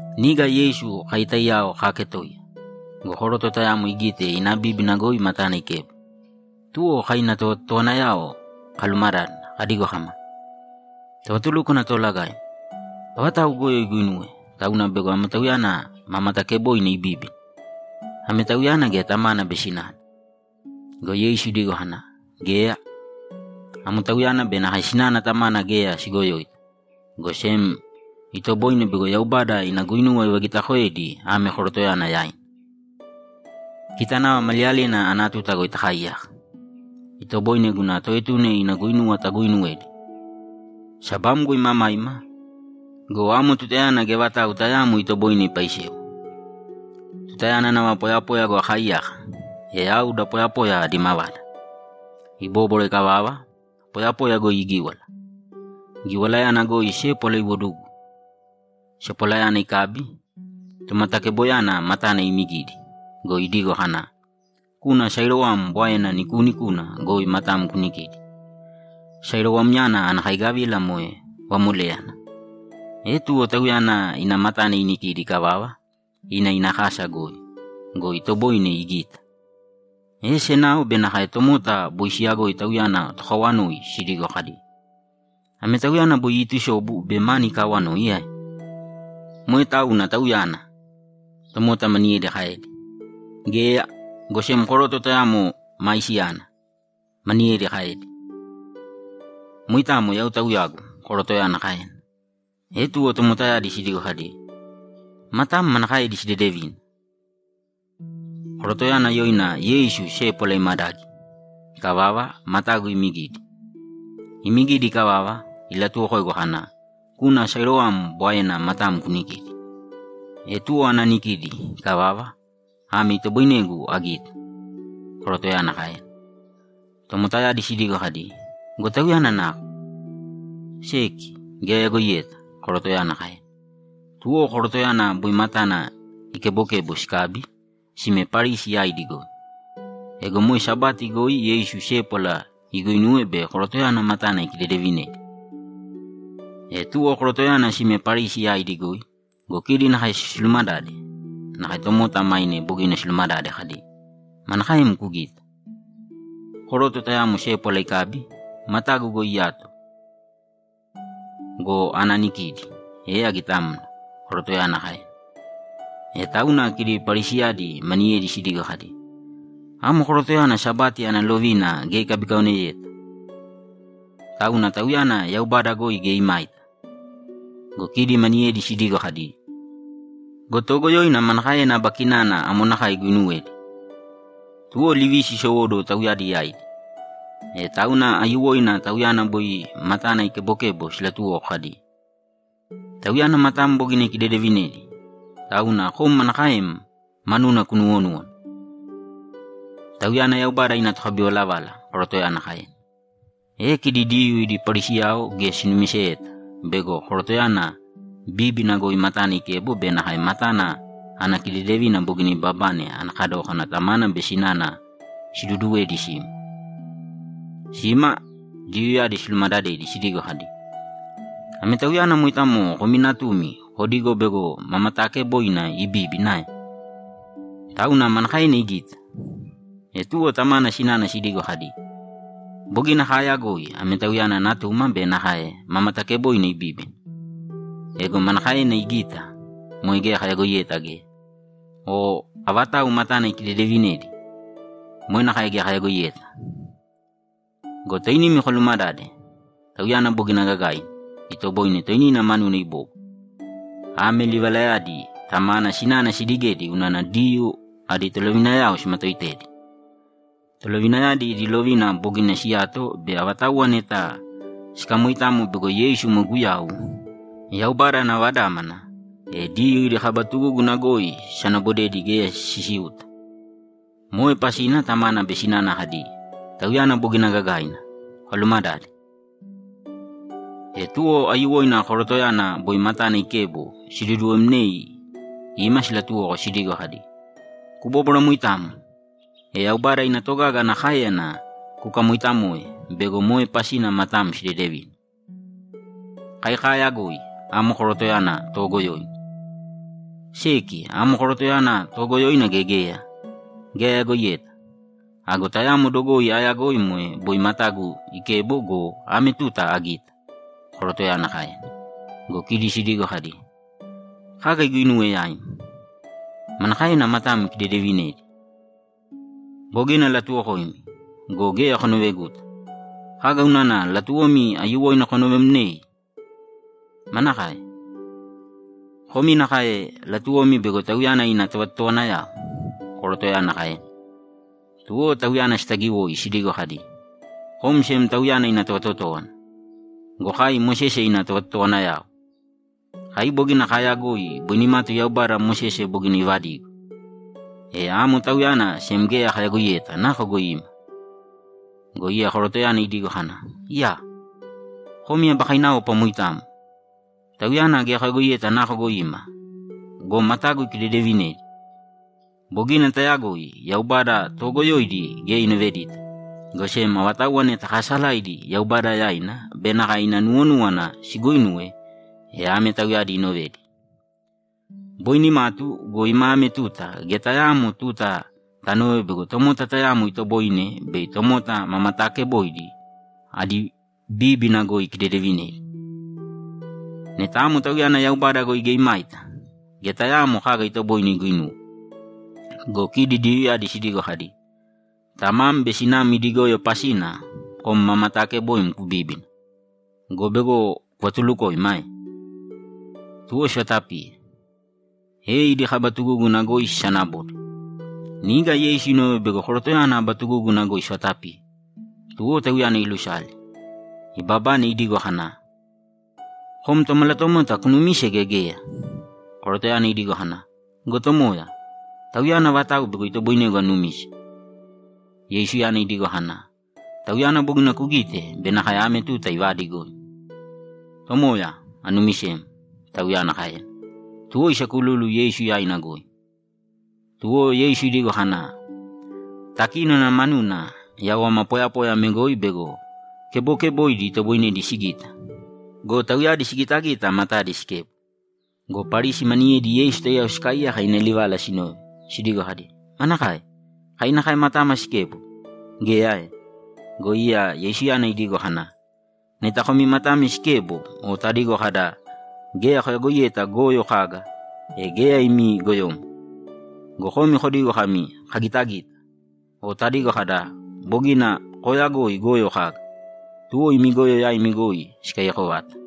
Niga Yeisu kai taiyao kaaketoiya go, koroto tayamo igite ina bíbina goi matana ikebo. Tuwo kai ina tovatotowanayao kalumadádana kadigo kama, ‘Tovatulúkwana Toolagaim, avatau goyo iguinuwe, tauna bego ame tauyana ma mataakeboina ibíbina? Ame tauyana gea tamana be sinana?’ Go Yeisu idigo kana, ‘Geya. Ame tauyana be nakae sinana tamana geya sigoyoita, go sem itoboine bego Yaubada ina guinuwa ivagitakoedi ame korotoyana yaina. Kita nava maliyalina ana tuta goi takaaiyaka, itoboine guna Toetuna ina guinuwa taguuinuwedi. Sabamgo imamaima go, amo tutayana geya vatau tayaamo itoboine ipaisewa. Tutayana nava poyapoya goi akaaiyaka, e yau da poyapoya adi mavada.’ Ibóbwara ikavava, poyapoya goi igíwala. Giwalayana goi sépwala iwodugu. Sepwalayana ikabi, tomatakeboyana matana imigidi go, idigo kana, ‘Kūna Siloam bwaena nikuunikuna goi matam kunikīdi.’ Siloamyana ana kaigavila moe vamoléyana. E tuwo tauyana ina matana inikidi ikavava, ina ina kasa goi go, itoboine igita. E senao be nakae tomota boi siyagoi tauyana tokawanoi sidigo kadi, ‘Ame tauyana boi iitusobu be mani ikaawanoi ae?’ ‘Moe tauna tauyana’, tomota maniyedi kaedi. ‘Geya, go sem koroto tayamo maisiyana’, maniyedi kaedi. ‘Moitamo yau tauyagu’, korotoyana kaena. E tuwo tomotayadi sidigo kadi, ‘Matam manakaedi sidedevina?’ ‘Korotoyana yoina Yeisu sépwala imadagi. Ikavava, matagu imigidi. Imigidi ikavava, ilatuwokoigu kana, “Kūna Siloam bwaena matam kunikīdi.” E tuwo ana anikidi ikavava, ame itoboinegu agita’, korotoyana kaena. Tomotayadi sidigo kadi, ‘Go Tauyana nako?’ ‘Seki, geya ayagoiyeta’, korotoyana kaena. Tuwo korotoyana boi matana ikebokebo sikabi, sime Parisi yaidi goi. Ego moe Sabati goi Yeisu sépwala iguinuwe be korotoyana matana ikidedevinedi. E tuwo korotoyana sime Parisi yaidi goi go, kidi nakae silumadade nakae tomota maine bogina silumadade kadi, ‘Manakaem kugita?’ ‘Koroto tayamo sépwala ikabi, matagu goi iyato go, ana anikidi, e agitamna’, korotoyana kaena. E tauna kidi Parisiyadi maniyedi sidigo kadi, ‘Amo korotoyana Sabati ana lovina geya ikabikaoneyeta, tauna Tauyana Yaubada goi geya imaita!’ Go kidi maniyedi sidigo kadi, ‘Go toogoyoina manakaena aba kinana amo nakae iguinuwedi?’ Tuwo livisi isowóduwo tauyadi yaidi. E tauna aiyuwoina tauyana boi matana ikebokebo silatuwoko kadi, ‘Tauyana matam bogina ikidedevinedi, tauna kom manakaem manuna kunuwonúwana?’ ‘Tauyana Yaubada ina tokabivalavala’, korotoyana kaena. E kidi Diyuu idi Parisiyao geya sinumiseta bego korotoyana bíbina goi matana ikebo be nakae matana ana kidedevina bogina ibabane ana kadókana tamana be sinana siduduwedi sima. Sima, Diyuuyadi silumadadedi sidigo kadi, ‘Ame tauyana moitamo komi natumi kodigo bego ma mataakeboina ibíbina ae? Tauna manakaena igita?’ E tuwo tamana sinana sidigo kadi, ‘Bogina kaayagoi ame tauyana natuma be nakae ma matakebokeboina ibíbina. Ego manakaena igita, moe geya kayagoiyeta geya. O avatau matana ikidedevinedi, moe nakae geya kayagoiyeta. Go toinimi kolumadāde. Tauyana bogina gagaina; itoboine toinina manuna ibóbwara.’ Ame livalayadi tamana sinana sidigedi unana Diyuu adi tolovinayao simatooitedi. Tolovinayadi idi lovina bogina siyato bei avatauwa neta sikamoitamo bego Yeisu moe Guyau, Yaubada ana Vadámana, e Diyuu idi kaba tugúguna goi sisanabodedi geya sisiuta. Moe pasina tamana be sinana kadi, ‘Tauyana bogina gagaina, kolumadāde.’ E tuwo aiyuwoina korotoyana boi matana ikebo siduduwemnei ima silatuwoko sidigo kadi, ‘Kubóbwara moitamo, e Yaubada ina togaga ana káeyana kukamoitamoe bego moe pasina matam sidedevina. Kai kaayagoi amo korotoyana toogoyoina.’ ‘Seki, amo korotoyana toogoyoina gea geya, geya ayagoiyeta. Ago tayamo dogoi aayagoi moe boi matagu ikebo go, ame tuta agita’, korotoyana kaena. Go kidi sidigo kadi, ‘Kaga iguinuwe yaim? Manakaena matam ikidedevinedi?’ ‘Bogina alatuwokoimi go, geya konoveguta. Kaga unana latuwomi aiyuwoina konovemnei? Manakae? Komi nakae latuwomi bego Tauyana ina tovatotowanayao?’ korotoyana kaena. Tuwo tauyana sitagiwoi sidigo kadi, ‘Kom sem Tauyana ina tovatotówana go, kai Mosese ina tovatotowanayao! Kai bogina kaayagoi boi nimatu Yaubada Mosese bogina ivadigo. E amo Tauyana sem geya kayagoiyeta nako goi ima!’ Go iya korotoyana idigo kana, ‘Iyaa! Komi aba kainaopa moitamo! Tauyana geya koyagoiyeta nako goi ima go, matagu ikidedevinedi! Bogina tayagoi Yaubada toogoyoidi geya inovedita, go sem avatauwa neta kaasalaidi Yaubada yaina be nakae ina nuwonúwana siguuinuwe, e ame tauyadi inovedi. Boi nimatu go, ima ame tuta geya tayaamo tuta tanove bego tomota tayamo itoboine bei tomota ma mataakeboidi adi bíbina goi ikidedevinedi. Neta amo Tauyana Yaubada goi geya imaita, geya tayaamo kaga itoboine iguinuwe.’ Go kidi Diyuuyadi sidigo kadi, ‘Tamam be sinam idi goyo pasina kom ma mataakeboim kubíbina go, bego kuvatulukoima ae?’ Tuwo sivatapiye, e idi kaba tugúguna goi sisanabode. Niga Yeisu inove bego korotoyana aba tugúguna goi sivatapiye. Tuwo tauyana ilusale, ibabane, idigo kana, ‘Kom Tomalatomota kunumise gea geya?’ Korotoyana idigo kana, ‘Go tomoya, Tauyana avatau bego itoboinegu anumise.’ Yeisuyana idigo kana, ‘Tauyana bogina kugite be nakae ame tuta ivaadigoim.’ ‘Tomoya, anumisem’, tauyana kaena. Tuwo isakululu Yeisu yaina goi. Tuwo Yeisu idigo kana, ‘Takínona manuna yau ama poyapoya ame goi bego kebokeboidi itoboinedi sigita go, tauyadi sigitagita matadi sikebo.’ Go Parisi maniyedi Yeisu taiyao sikaaiyaka ina livala sinove, sidigo kadi, ‘Manakae? Kai nakae matama sikebo? Geya ae?’ Go iya Yeisuyana idigo kana, ‘Neta komi matami sikebo o tadigo kada, “Geya koyagoiyeta goyo kaga”, e geya imi goyomo. Go komi kodigo kami, “Kagitagita”, o tadigo kada, “Bogina kooyagoi goyo kaga”, tuwo imi goyo yaimi goi sikaiyako vata.’